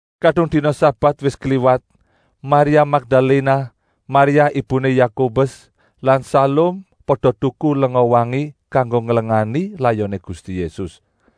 Kadung dina sabat wis kliwat, Maria Makdaléna, Maria ibuné Yakobus lan Salum pada tuku lenga wangi kanggo nglengani layoné Gusti Yésus.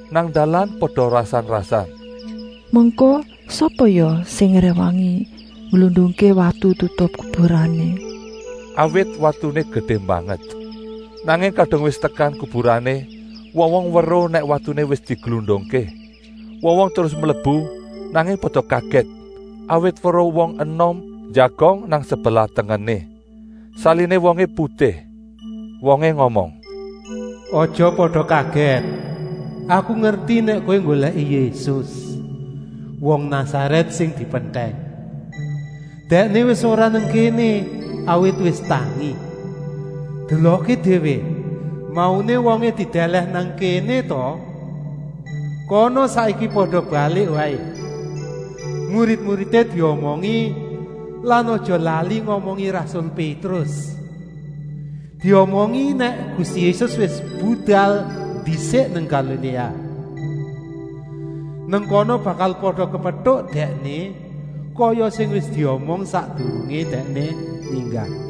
Nang dalan pada rasan-rasan: “Mengko sapa ya sing ngréwangi ngglundungké watu tutup kuburané?” Awit watuné gedé banget. Nanging kadung wis tekan kuburané, wong-wong weruh nèk watuné wis diglundungké. Wong-wong terus mlebu, nanging pada kagèt, awit weruh wong enom njagong nang sebelah tengené. Saliné wongé putih. Wongé ngomong: “Aja pada kagèt. Aku ngerti nèk kowé nggolèki Yésus, wong Nasarèt sing dipentèng. Dèkné wis ora nang kéné, awit wis tangi. Delokké déwé, mauné wongé didèlèh nang kéné ta? Kana saiki pada balik waé. Murid-muridé diomongi lan aja lali ngomongi rasul Pétrus. Diomongi nèk Gusti Yésus wis budal ndisik nang Galiléa. Nang kana bakal pada kepetuk Dèkné, kaya sing wis diomong sakdurungé Dèkné ninggal.”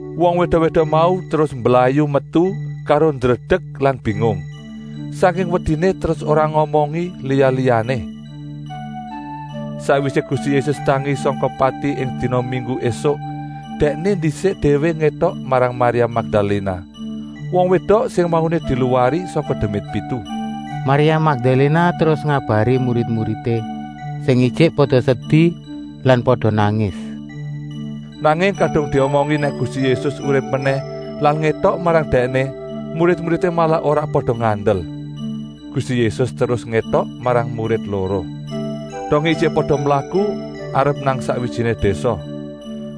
Wong wédok-wédok mau terus mblayu metu karo ndredek lan bingung. Sangking wediné terus ora ngomongi liya-liyané. ( Sakwisé Gusti Yésus tangi sangka pati ing dina minggu ésuk, dèkné ndisik déwé ngétok marang Maria Makdaléna, wong wédok sing mauné diluwari sangka demit pitu. Maria Makdaléna terus ngabari murid-muridé sing ijik pada sedi lan pada nangis. Nanging kadung diomongi nèk Gusti Yésus urip menèh lan ngétok marang dèkné, murid-muridé malah ora pada ngandel. Gusti Yésus terus ngétok marang murid loro, dongé ijik pada mlaku arep nang sakwijiné désa.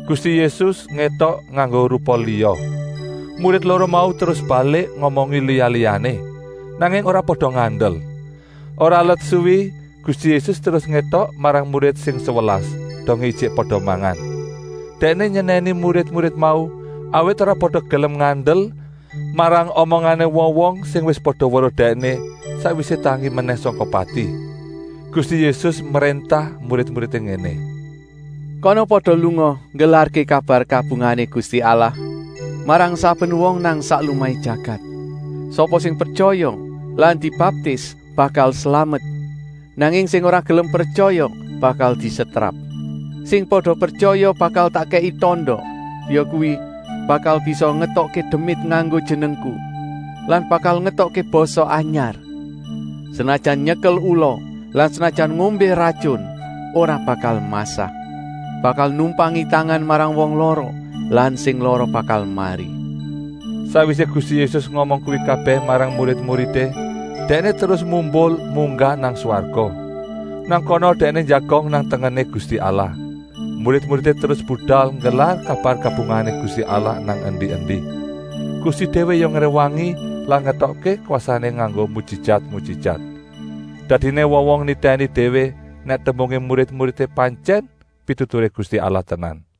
Gusti Yésus ngétok nganggo rupa liya. Murid loro mau terus balik ngomongi liya-liyané, nanging ora pada ngandel. Ora let suwi Gusti Yésus terus ngétok marang murid sing sewelas, dongé ijik pada mangan. Dèkné nyenèni murid-murid mau, awit ora pada gelem ngandel marang omongané wong-wong sing wis pada weruh Dèkné, sakwisé tangi menèh sangka pati. Gusti Yésus mréntah murid-muridé ngéné: “Kana pada lunga nggelarké kabar kabungahané Gusti Allah marang saben wong nang sak lumahé jagat. Sapa sing pretyaya lan dibaptis bakal slamet, nanging sing ora gelem pretyaya bakal disetrap. Sing pada pretyaya bakal tak kèki tanda, yakuwi, bakal bisa ngetokké demit nganggo jenengku lan bakal ngetokké basa anyar. Senajan nyekel ula lan senajan ngombé ratyun ora bakal masah. Bakal numpangi tangan marang wong lara lan sing lara bakal mari.” Sakwisé Gusti Yésus ngomong kuwi kabèh marang murid-muridé, Dèkné terus mumbul munggah nang swarga. Nang kana Dèkné njagong nang tengené Gusti Allah. Murid-muridé terus budal nggelar kabar kabungahané Gusti Allah nang endi-endi. Gusti déwé ya ngréwangi lan ngétokké kwasané nganggo mujijat-mujijat. Dadiné wong-wong nitèni déwé nèk tembungé murid-muridé pantyèn pituturé Gusti Allah tenan.)